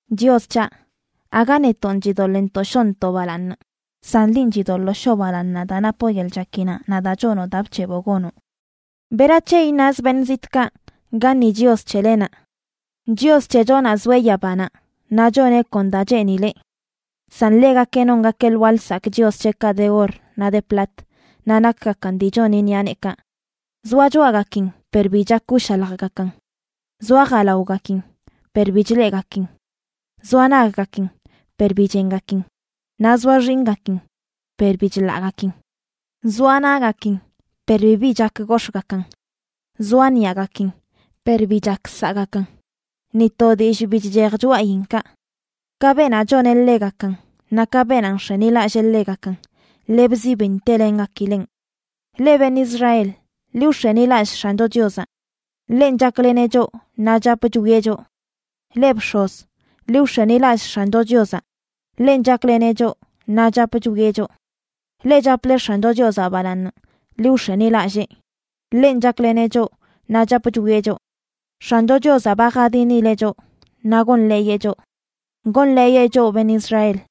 Chios c̱haꞌ, aga netonꞌ chidoḻꞌntoꞌ shoontoꞌ balaaṉ, san linꞌ chidoḻoo shoo balaaṉnaꞌ daa napoꞌ yeḻꞌ chakinaꞌ naꞌ daa chonoꞌ daa bc̱heboꞌ gonoꞌ. ¿Berac̱he iṉaz beṉꞌ zitꞌkaꞌ: “Gaṉi Chios c̱helenaꞌ?” Chios c̱hechonaꞌ zoeꞌ yabanaꞌ; naꞌ choneꞌ kon da cheenileꞌ. San ḻegakeꞌ nongakeꞌ lwaa lsakꞌ chios c̱heꞌkaꞌ de or naꞌ de plat, naꞌ nakgakan dii choni ṉiꞌa neekaꞌ. Zoa choꞌagakin per bi chak wshaljgakan, zoa jalaogakin per bi chleꞌgakin; zoa naggakin per bi chengakin, naꞌ zoa xinꞌgakin per bi chḻaꞌgakin. Zoa naꞌgakin per bibi chak gox̱ꞌgakan; zoa ṉiꞌagakin per bi chak saꞌgakan; ¡ni to dillꞌ bi chchej choꞌayinkaꞌ! Ka beenaꞌ choneꞌ ḻegakan, naꞌ ka beenaꞌ nx̱enilallee ḻegakan, lebzi bi ntelengakileꞌn. Leꞌ beṉꞌ Israel, ¡ḻi wx̱enilallꞌ X̱ancho Chiozaꞌ! Ḻenꞌ chakleneꞌ choꞌ naꞌ chap chwieꞌ choꞌ. Leꞌ bx̱oz, ¡ḻi wx̱enilallꞌ X̱ancho Chiozaꞌ! Ḻenꞌ chakleneꞌ choꞌ naꞌ chap chwieꞌ choꞌ. Leꞌ chaple X̱ancho Chiozaꞌ balaaṉ, ¡ḻi wx̱enilallee! Ḻenꞌ chakleneꞌ choꞌ naꞌ chap chwieꞌ choꞌ. ¡X̱ancho Chiozaꞌ ba jadinileꞌ choꞌ naꞌ gonḻeeyeꞌ choꞌ! Gonḻeeyeꞌ choꞌ beṉꞌ Israel.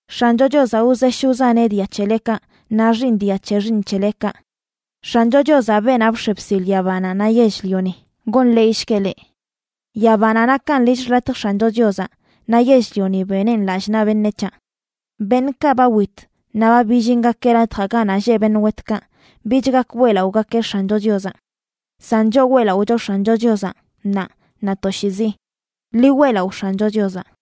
¡X̱ancho Chiozaꞌ wzesh wzaneꞌ dia c̱helekaꞌ naꞌ xiiṉ dia c̱he xiiṉ c̱helekaꞌ! ¡X̱ancho Chiozaꞌ, beenaꞌ bx̱e bsil yabanaꞌ naꞌ yell-lioni, gonḻeeyshgueꞌ leꞌ! Yabanaꞌ nakan lill xḻatj X̱ancho Chiozaꞌ, naꞌ yell-lioni beneꞌn lall naꞌ beṉec̱haꞌ. Beṉꞌkaꞌ ba wit naꞌ ba billingake latjaꞌ ganaꞌ lleꞌ beṉꞌ wetkaꞌ, bich gak weꞌlaꞌogakeꞌ X̱ancho Chiozaꞌ. San choꞌ weꞌlaꞌocho X̱ancho Chiozaꞌ ṉaa naꞌ toshiizi. ¡Ḻi weꞌlaꞌo X̱ancho Chiozaꞌ!